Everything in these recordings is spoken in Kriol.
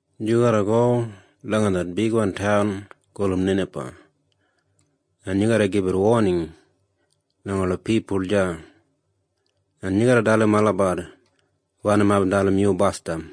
“Yu garra go langa det taun gulum Ninaba, en yu garra gibit woning langa ola pipul deya. Yu garra dalim olabat wanim aibin dalim yu basdam.”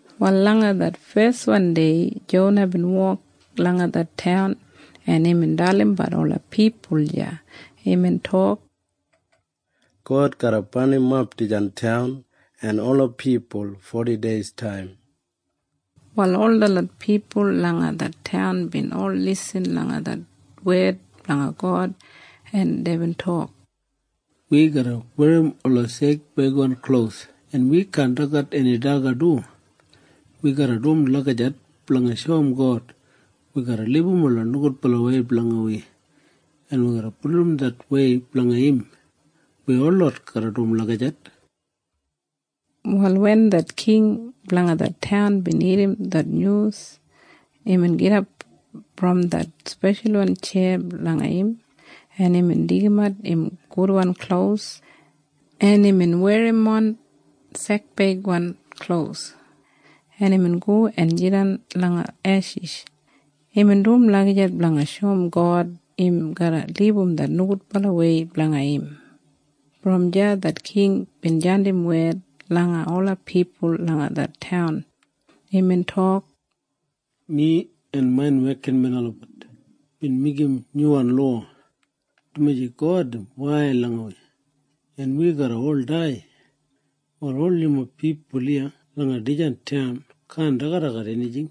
Wal langa det feswan dei Jona bin wok langa det taun, en imbin dalimbat ola pipul deya. Imbin tok, “God garra barnimap dijan taun en ola pipul fodideistaim.” Wal ol detlot pipul langa det taun bin ol lisin langa det wed blanga God, en deibin tok, “Wi garra werrimon ola sekbeigwan klos, en wi kaan dagat eni daga du. Wi garra dum lagijat blanga shoum God wi garra libum ola nogudbalawei blanga wi en bulurrum det wei blanga im. Wi holot garra dum lagijat.” Wal wen det king blanga det taun bin irrim det nyus, imbin gidap brom det speshalwan tjeya blanga im, en imbin deigimat im gudwan klos, en imbin werrimon sekbeigwan klos, en imbin go en jidan langa eshis. Imbin dum lagijat blanga shoum God im garra libum det nogudbalawei blanga im. Brom deya det king bin jandim wed langa ola pipul langa det taun. Imbin tok, “Mi en main wekinmen olabat bin meigim nyuwan lowa, dumaji God im wail langa wi, en wi garra ol dai. Wal ol yumob pipul iya langa dijan taun kaan dagadagat enijing,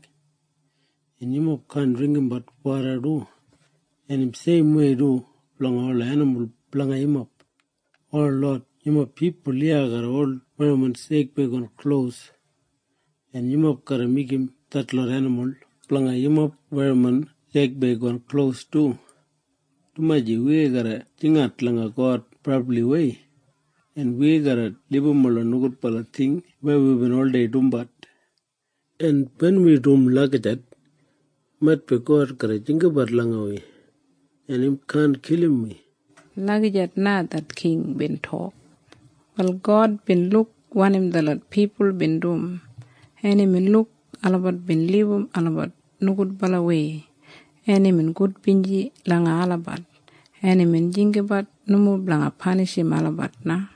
en yumob kaan dringgimbat woda du. En im seimwei du blanga ola enimul blanga yumob. Holot yumob pipul iya garra ol werrimon sekbeigwan klos, en yumob garra meigim detlot enimul blanga yumob werrimon sekbeigwan klos du, dumaji wi garra jingat langa God brabliwei, en wi garra libum ola nogudbala ting weya wibin oldei dumbat. En wen wi dum lagijat, maitbi God garra jinggabat langa wi, en im kaan kilim wi.” Lagijat na det king bin tok. Wal God bin luk wanim detlot pipul bin dum, en imbin luk olabat bin libum olabat nogudbalawei, en imbin gudbinji langa olabat, en imbin jinggabat nomo blanga panishim olabat na.